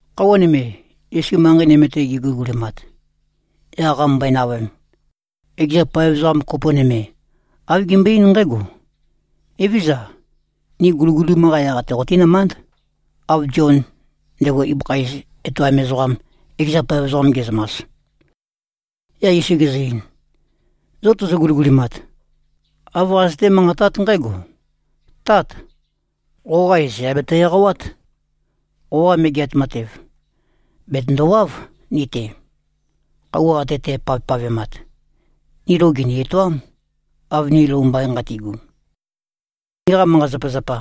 Khøuwa nøme, Yesu manqei nøme-te geguligulimat, yaq qamømbøe-navøem, ekeza paev ezoqa kopo nøme, āv gembøe-eín nqǽgo, “Evézøza. Ni guligulim-qa yaq-te qotínømánd, av Zion, ndego ezoqa ibøkha iz etoam ezoqam, ekeza paev ezoqam ge꞉zømas.” Yaq Yesu gezø-ein, “Zo tozo-guligulimat, āv qazøté-manqatát nqǽgo, ‘Tát! Qoqa iz yà beto-eqawát. Qoqa Megeat Matev, bètøndowáv ni-te. Khøuwa ate tæpavpavemat, ni lou gìni-etoám, av ni lou mbain nqati꞉gu. Niqa manqa-zapazapa,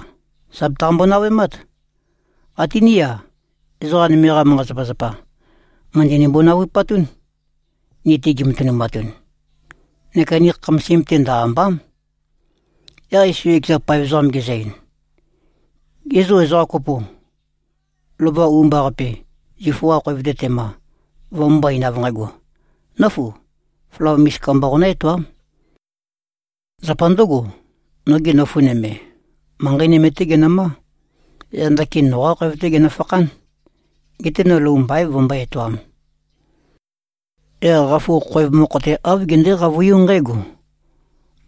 sà betaqambo-navøemát. Até ní-a, ezoqa nøme-qa manqa-zapazapa, mø̀ndønimbo-navupatún, ni-te gimatønumatun. Neka ni khamasim-te ndø-àmba᷄m.’” Yaq Yesu ekeza paev ezoqam gezø-ein, “Ge zô, ezoqa kopo, lova u-mba-qape zifu-qa khoev-te tema, vømømbó-eīn av nqægo, ‘Nǿfu. Flawa misika mba qonø̄-etoām. Zapa ndø̄go, noge nøfu nøme, manqei nøme-tē genømā. Yaq ndakin noqā khoev-tē genøfakhān. Geté no lou mbaīn vømbǿe-etoām.’ Yaq qafu khoev mokho-te āv gendē-qavøiū nqǣgo,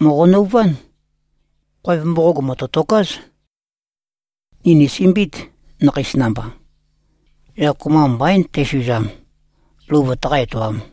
‘Mòqo-nøuvān! Khoev mboqog mø̀tøtokāz. Ni nìsømbiīt, nakheis namba. Yaq kopømba mbaīn tæsuzam, lou vøtaqá-etoām.’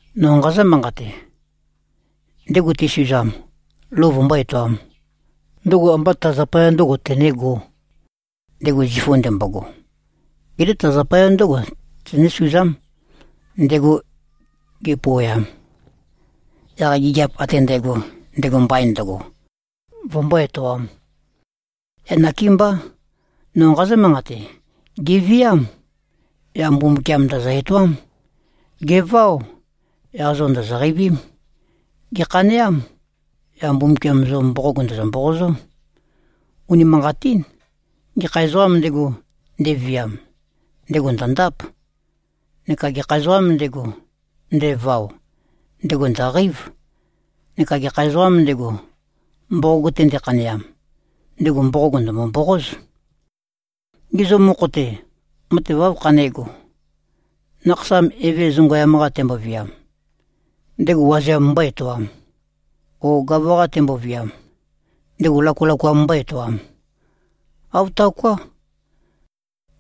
No nqazǿ-manqate: Ndego tesuzam, lou vømbó-etoām, ndøgo ambá ta zapaya ndø̄go tenégō, ndego zifu ndembogo. Geté ta zapaya ndǿgo tenésuzám, ndego ge꞉pouweam, yaq gigiap ate ndægo, ndego mbain ndøgo, vømbó-etoām. Yaq nakémbá. No nqazǿ-manqate: Gèviám. Yaq Mbumbukiam ndø̀zø-etoám. Gèváo. Yaq zo ndòzo-qeivím. Gèkhaneám. Yaq Mbumbukiam zo mboqog ndø̀zø-mboqozó. Unimanqatín. Gekha ezoqām ndego, ndeviam, ndego ndø̀ndáp. Neka gekha ezoqām ndego, ndevao, ndego ndø̀qeív. Neka gekha ezoqām ndego, mboqog-te ndekhaneam, ndego mboqog ndø̀mbo-mboqóz. Gê, zo mokho-te, matev áv khanégo? Nakhasam eve zongøyam-qa temboviam, ndego wazeam mbó-etoām? O gava-qa temboviam, ndego lakalakoam mbó-etoām? Āv taoká.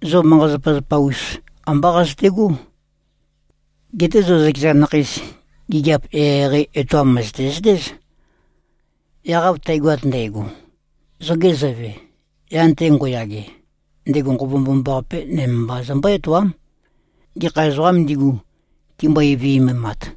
Zo manqa-zapazapa-us, ambá qazøtegó. Geté zo zøkeza nakheis, gigiap eqeieqei etoam mø̀zøte-zøtéz. Yaq av tægoat ndægo, zoge Zøve, yan-te ngo꞉yage, ndego Nqova Mbomambaqape nøme mba zømbó-etoám, gekha ezoqām ndigu, timbøe-viømemat.”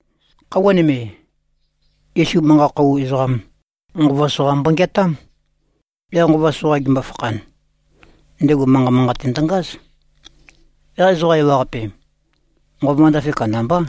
Khøuwa nøme, Yesu manqa-khou ezoqam, nqova soqa mbongeatám. Yaq nqova soqa gembo-fakhan, ndego manqa manqate ndøngáz. Yaq ezoqa ewaqape, nqova ndafe kandambá.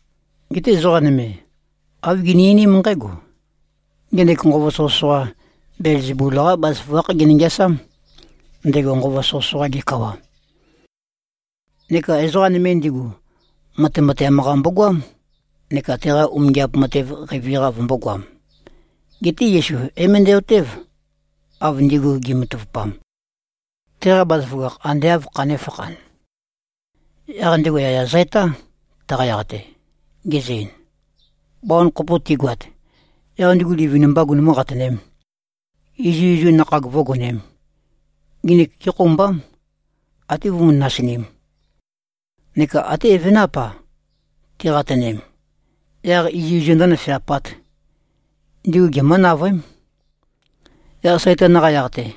Geté ezoqa nøme, āv gini-einím nqǽgo, “Ngenek nqova soqøsoqa, Belzebul-qá bazaføgákh gene-ngeasám, ndego nqova soqøsoqa-ge kawa.” Neka ezoqa nøme ndigu, matemateam-qa mbogoám, neka teqa umingiap matev qeivi-qa vømbōgoam. Geté Yesu é-møndæ-otév, av ndigu gi꞉matavupam, teqa bazaføgakh ande āv khanēfakhan. Yaq ndego yaya zø-etá, taqa yaq-te, gezø-ein, “Bawan kopo tigoat, yaq ndigu livin-mbā gunumú-qatønēm, izuizu nakhag vǿgonēm, nginik gékhoumbám, até vømú-nasinīm. Neka até evenáp-a, tiqatønem, yaq izuizu ndǿnøfeapāt, ndigu gemǿ-navøém. Yaq Saitan-qa yaq-te,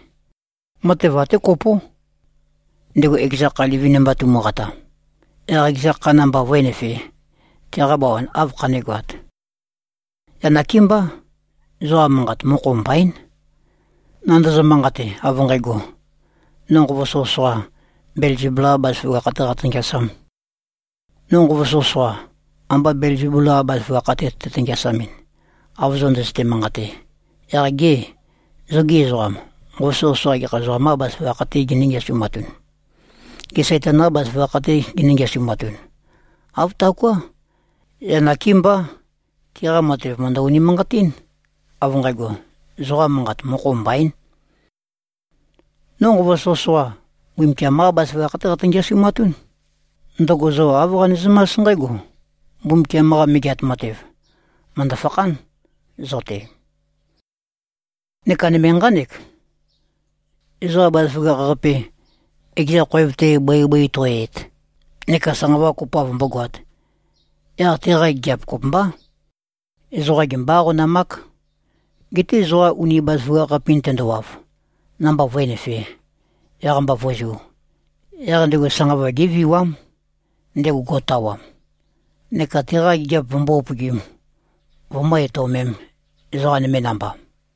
matev até kopó. Ndego ekeza kha livin-mba tumuqata, yaq ekeza kha namba vǿenøfē, teqa bawan áv khanégoāt? Yaq nakémbá, zoqa manqat mokho mbaín, nandozo-manqate av nqægo, no nqova soqøsoqa, Belzebul-qā bazaføgakh-tē qatø-ngeasām. No nqova soqøsoqa, amba Belzebul-qa bazaføgakh-te tøte-ngeasamɨn, av zo ndøzøte-manqate, yaq gê, zogī ezoqam, nqova soqøsoqa gekha ezoqam-qā bazaføgakh-tē ginǿ-ngeasumatun? Gê, Saitan-qā bazaføgakh-tē ginǿ-ngeasumatun. Āv taoká. Yaq nakémbá. Tiqa matev mø̀ndø-unimanqatín, av nqægo, zoqa manqat mokho mbaín. No nqova soqøsoqa, Mbumbukiam-qá bazaføgakh-té qatø-ngeasumatún. Ndøgo zo āv qanezømás nqǽgo: Mbumbukiam-qa Megeat Matev, mø̀ndø-fakhán zo-te. Neka nøme nqánek: Ezoqa bazaføgakh-qape, ekeza khoev-te bøibøi to꞉yøet neka sanqava kopoav vømbógoāt, yaq teqa gigiap kopømbá. Ezoqa gembó-aqonamák. Geté ezoqa uni bazaføgakh-us-qape-in tendowav, namba vǿenøfē, yaq-mba vǿzū, yaq ndego sanqava géviwám, ndego go꞉tawam, neka teqa gigiap vømbó-upøgīm, vømǿ-etøomēm, ezoqa nøme namba.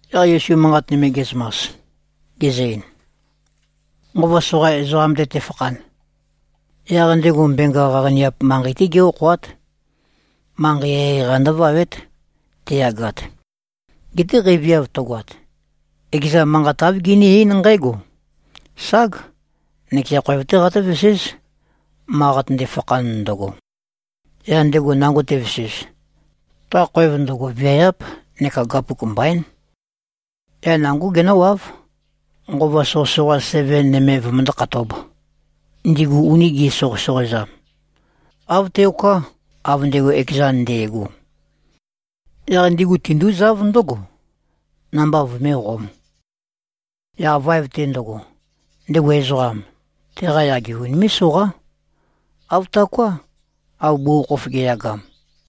Yaq Yesu manqat nøme ge꞉zømas, gezø-ein, “Nqova soqa ezoqam-te tefakhan, yaq ndego mbenga qaqaniap manqei-té gé-okhoát. Manqei eqeieqei-qa ndǿvawét, te꞉yagat. Geté qeiviav tøgoat, ekeza manqat āv gené-eín nqǽgo, ‘Ság. Nøkeza khoev-té qatǿveséz, ma qatønde-fakhan ndøgo.’ Yaq ndego nango tevesez, ta khoev ndøgo viayáp neka gapuk mbaín. Yaq nangó genǿwáv, nqova soqøsoqa seven nøme vømøndó-khatōb, ndigu uni gi꞉soqøsoqoezam. Āv teoká, av ndego ekezan nde꞉go. Yaq ndigu tindúzáv ndǿgo, namba vøméqōm. Yaq vaev-te ndøgo, ndego ezoqam, teqa yage unimé꞉-soqá. Āv taoká, av bugukhokhof ge꞉yagam.”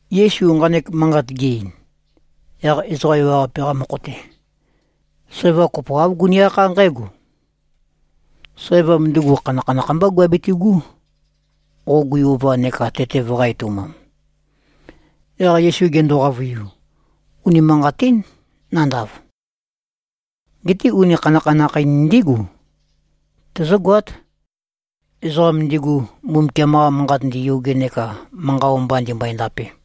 Yesu nqanek manqat ge-ein, yaq ezoqa ewaqape-qa mokho-te, sæva kopo āv guni-akhá nqǽgo, “Sævam ndugu khanakhanakh mbá guabitigú, qo gui-ova neka tete vøqā-etoumam.” Yaq Yesu gendo-qavøiu, “Unimanqatín, nandav. Geté uni khanakhanakh-in ndígu tøzǿgoát, ezoqam ndigu, Mbumbukiam-qa Manqat ndīyōgē neka manqa o-mba ndīmbø̄ē-ndāpē.”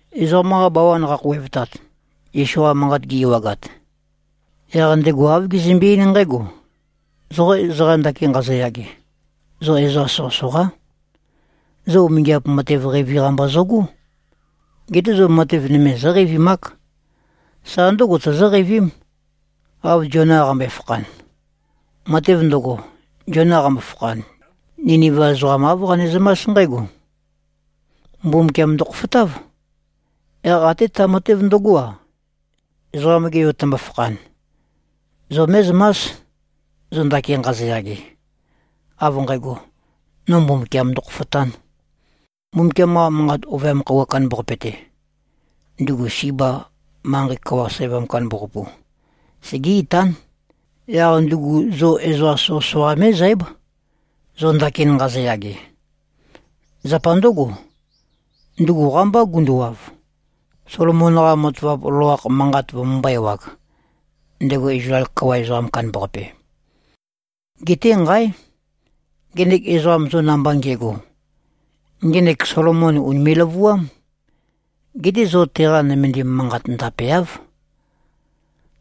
Ezoqam-qa bawan qakhouwevtat, Yesu-qa manqat gi-ewagat, yaq ndego āv gezømbe-eín nqǽgo, “Zo ezoqa ndakin nqazoyage, zo ezoqa soqøsoqá. Zo umingiap matev qeivi-qa mba zøgó. Geté zo matev nøme zóqeivimák. Sa ndǿgo tozóqeivím, av Ziona qambøe-fakhan. Matev ndøgo, Ziona qambo-fakhan, Niniva ezoqam āv qanezømás nqǽgo: Mbumbukiam ndokhofotáv. Yaq até ta matev ndøgó-a, Ezoqam-ge Yo tømbo-fakhan, zo mé꞉zømás, zo ndakin nqazoyage, av nqægo, no Mbumbukiam ndokhofotān. Mbumbukiam-qa Manqa Ovøyam Khøuwa Kandambaqape-te, ndugu Siba manqei kawa sævam kandambaqapu, segé-itán. Yaq ndugu zo ezoqa soqøsoqa mé꞉zǽb, zo ndakin nqazoyage. Zapa ndǿgo, ndugu qámbá gunduwav, Solomon-qa matavap loloakh manqat vømømbō-ewag, ndego Izlael kawa ezoqam kandambaqape. Geté, nqáe! Ngenek ezoqam zo namba nge꞉go, ngenek Solomon ùnime꞉-løvuám. Geté zo teqa nømendim manqat ndapeáv.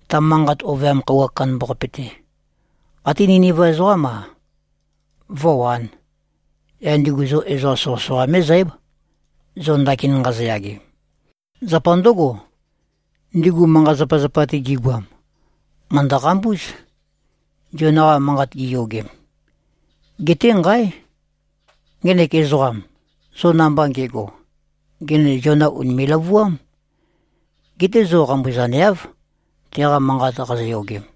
Ta Manqa Ovøyam Khøuwa Kandambaqape-te, até Niniva ezoqám-a, vǿwān. Yaq ndigu zo ezoqa soqøsoqa mé꞉zǽb, zo ndakin nqazoyage. Zapa ndǿgo, ndigu manqa-zapazapa-te gigoam, màndo-qambúz, Ziona-qa manqat giyogem. Geté, nqáe! Ngenek ezoqam, zo namba nge꞉go, ngenek Ziona ùnime꞉-løvuám. Geté zo qambuzaneáv, teqa manqat qazoyogem.”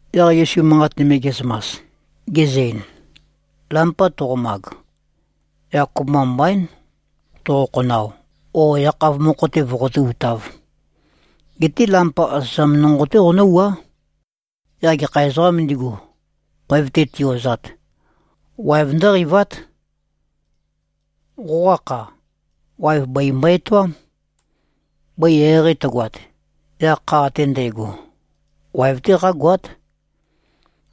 Yaq Yesu manqat nøme ge꞉zømas, gezø-ein, “Lampa toqomag, yaq kopømba mbaín toqo-khonao o yakhav mokho-te voqotú-utāv. Geté lampa asøzam nonqo-té qonǿwuá. Yaq gekha ezoqām ndigu, khoev-te ti-ozat, waev ndǿqeivát. Qoqa kha, waev bøi mbo-etoám. Bøi eqeieqei tøgoat, yaq kha ate ndægo, waev-té qágoát.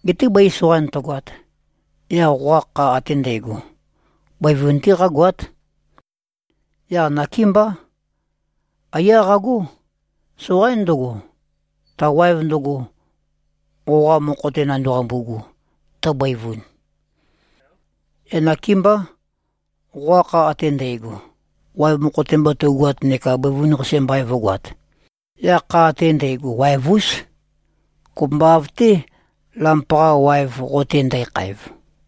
Geté bøi soqain tøgoat, yaq qoqa kha ate ndægo, bøivun-té qágoát. Yaq nakémbá. Aiyá qagó. Soqaín ndøgo, ta waev ndøgo, qoqa mokho-te nandaqambu꞉gu, tøbøivun. Yaq nakémbá, qoqa kha ate ndægo, waev mokho-te mba tøugoat neka bøivun-qase mbain vǿgoāt, yaq kha ate ndægo waev-ús, kopømba av-té, lampa-qa waev qo-te ndækhaev.”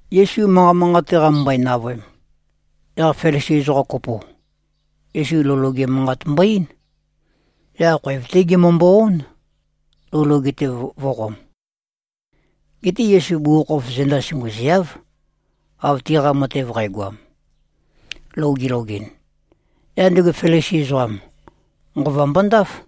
Yesu manqa manqate qamømbøe-navøem, yaq Felisi ezoqa kopo, Yesu lou loge manqat mbo-eín. Yaq khoev-té gemømbo-ón, lou loge-te vø̄qom. Geté Yesu bugukhokhof zenda sunguziav, av tiqa matev qægoam, lou gilogɨn. Yaq ndego Felisi ezoqam, nqova mbondáf.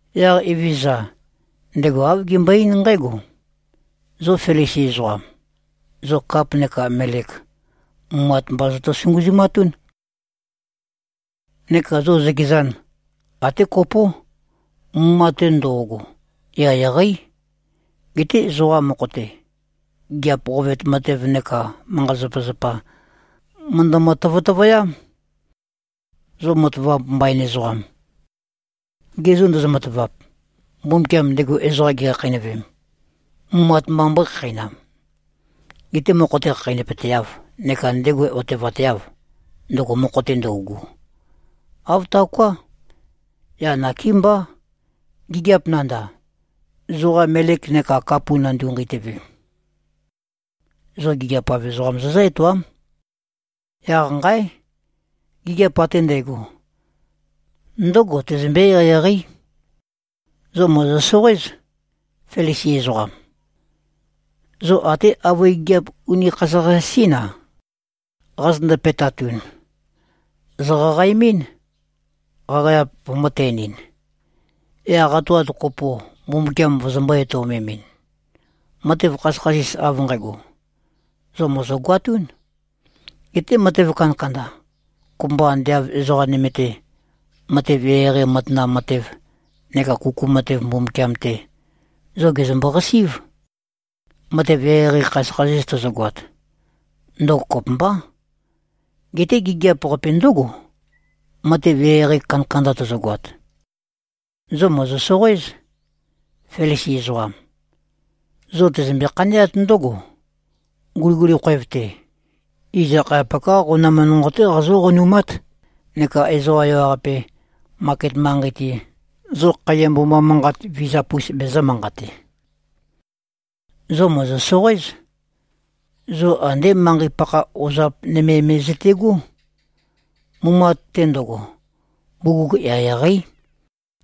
Yaq Evezøza, ndego āv gembøe-eín nqǽgo, “Zo Felisi ezoqam, zo kap neka melek, mumat mba zoto-sunguzumatún. Neka zo zøkezan, até kopó. Mumat-te ndo꞉go, eqeieqeí. Geté zoqa mokho-te, gigiap qovetu matev neka manqa-zapazapa, mø̀ndømø-tøtøvøyám. Zo matavap mbain ezoqam, ge zô ndozo-matavap, Mbumbukiam ndego ezoqam gekhakheinøvem, mumat mba mbøé-khakheinam, getē mokho-te khakheinøpøteâv neka ndego otevateâv, ndøgo mokho-te ndøugu? Āv taoká. Yaq nakémbá, gigiap nandav, zoqa melek neka kap nandu-nqeitøve, zo gigiap-av ezoqam zozǿ-etoám. Yaq nqáe! Gigiap ate ndægo, ndǿgo tøzømbé-eqeieqeí. Zo mòzo-soqoéz, Felisi ezoqam. Zo até avøe gigiap uni khasøkhasis-ín-a, qazøtøndo-pe꞉tatun, zòqaqaemɨ́n, qaqageap vømø̄-ten-ɨn, yaq qatoat kopo Mbumbukiam vozombō-etøomemɨn. Matev khasøkhasis av nqægo, zo mòzogoatún. Geté matev kandakanda, kopømba ande av ezoqa nøme-te, matev eqeieqei matanam matev, neka kuku matev Mbumbukiam-te, zo gèzømbo-qasí꞉v. Matev eqeieqei khasøkhasis tozogoat, ndøgo kopømbá. Geté gigiap-qape ndǿgo, matev eqeieqei kandakanda tozogoat. Zo mòzo-soqoéz, Felisi ezoqam. Zo tøzømbe-khaneát ndǿgo, guliguli khoev-te, iz akhayapak-qá qonam nonqo-té qazó-qonumát, neka ezoqa ewaqape, maket manqei-te, zo khaiya mboma manqat vizap-us bezø̄-manqate. Zo mòzo-soqoéz. Zo andé manqei-pakha ozap nøme me zøte꞉gó. Mumat-te ndøgo, bugug eqeieqeí.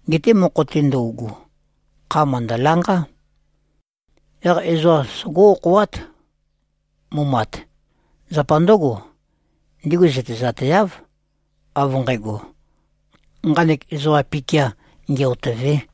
Geté mokho-te ndøugu, kha mø̀ndølanqá. Yaq ezoqa sogó-okhoát, mumat. Zapa ndǿgo, ndigu zøtezateáv, av nqægo, nqanek ezoqa-pikia nge-otø̂vē.”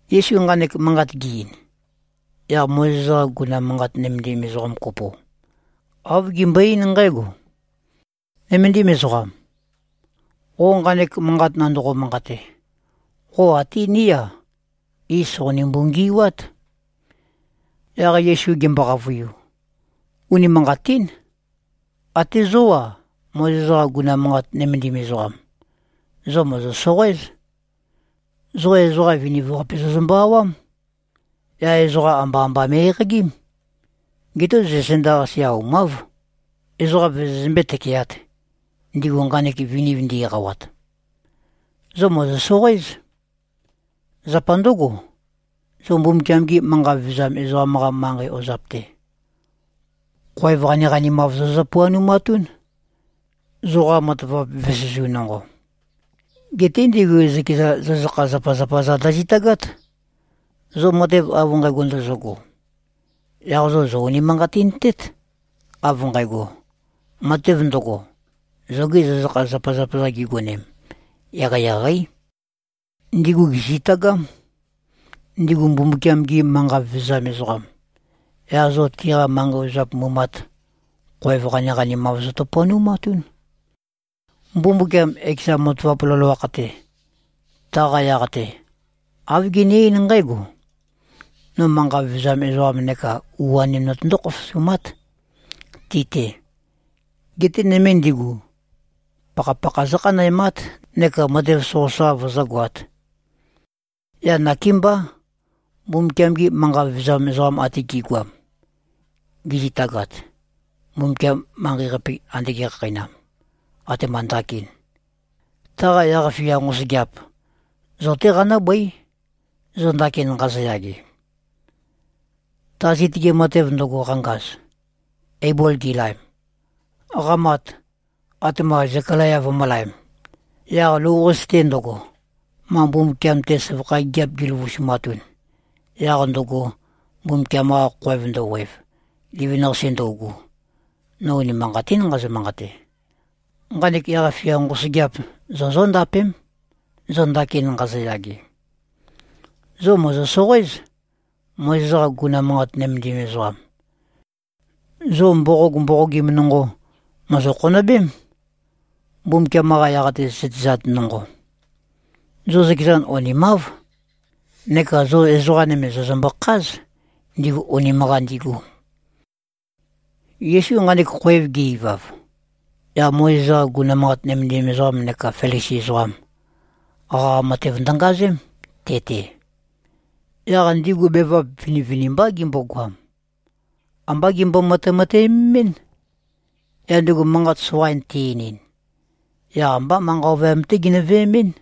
Yesu nqanek manqat ge-ein, yaq Mozes-qa guguna manqat nømendim ezoqa kopo, āv gembøe-eín nqǽgo, “Nøméndim ezoqam. Qo nqanek manqat nandoqo-manqate, qo até ní-a, iz sòqonimbu-ngi꞉wát.” Yaq Yesu gembo-qavøiu, “Unimanqatín. Até zó-a, Mozes-qa guguna manqat nømendim ezoqam, zo mòzo-soqoéz. Zo ezoqa viniv-qape zozømbø-awám. Yaq ezoqa amba-amba me꞉-eqagím. Geté zo zenda-qase aumáv, ezoqa vozozømbé-tøkeāt, ndigu nqanek viniv ndi-eqawat. Zo mòzo-soqoéz. Zapa ndǿgo, zo Mbumbukiam-gi manqa vevezam ezoqam-qa manqei ozap-te, khoev qaniqanimav zozø-puanumatún, zoqa matavap vesezu nonqo. Geté ndigu zøkeza zøzøkha-zapazapa-za ndøzitagát. Zo matev av nqægo ndozogo, yaq zo zò-unimanqatintét, av nqægo, matev ndøgo, zogi zøzøkha-zapazapa-za gigonem, eqeieqeí. Ndigu gèzitagám, ndigu Mbumbukiam-gi manqa vevezam ezoqam, yaq zo tiqa manqei ozap mumat, khoev qaniqanimav zozø-puanumatún. Mbumbukiam ekeza matavap loloakh-te, taqa yaq-te āv gene-eín nqǽgo, ‘No manqa vevezam ezoqam neka u-anim notøndó-khofosumát, ti-te. Geté nøme ndigu, pakhapakha zǿkhanæmát neka matev soqøsoqa vøzǿgoāt.’ Yaq nakémbá, Mbumbukiam-gi manqa vevezam ezoqam ate gi꞉goam gizitagat, Mbumbukiam manqei-qape ande ge꞉khakheinam, atema ndakin, taqa yaq-fia nqosøgeap, zo-té qanǿbøí, zo ndakin nqazoyage, ta zitøge matev ndøgo, qangaz, Eibol gilaem, qamat, atema Zekalaya vømø̄laem, yaq lou-qase-te ndøgo, ma Mbumbukiam-te søvakha gigiap giløvusumatun, yaq ndøgo, Mbumbukiam-qa khoev ndøwev, livin-qase ndøugu. No unimanqatín nqazø-manqate. Nqanek yaq-fia nqosøgeap, zo zóndapém, zo ndakin nqazoyage. Zo mòzo-soqoéz, Mozes-qa guguna manqat nømendim ezoqam. Zo mboqog mboqogim nonqo, mòzo-khonøbém, Mbumbukiam-qa yaq-te zøtezat nonqo. Zo zøkezan onimáv, neka zo ezoqa nøme zòzømbø-kház, ndigu onim-qa ndigu.” Yesu nqanek khoev ge-ivav, yaq Mozes-qa guguna manqat nømendim ezoqam neka Felisi ezoqam, qaqa matev ndøngazém, te-te. Yaq ndigu bevap vinivinimbá gimbogoam. Ambá gembo-matemateømemín. Yaq ndego manqat soqain te-einin, yaq ambá manqa ovøyam-té ginø-veemɨ́n.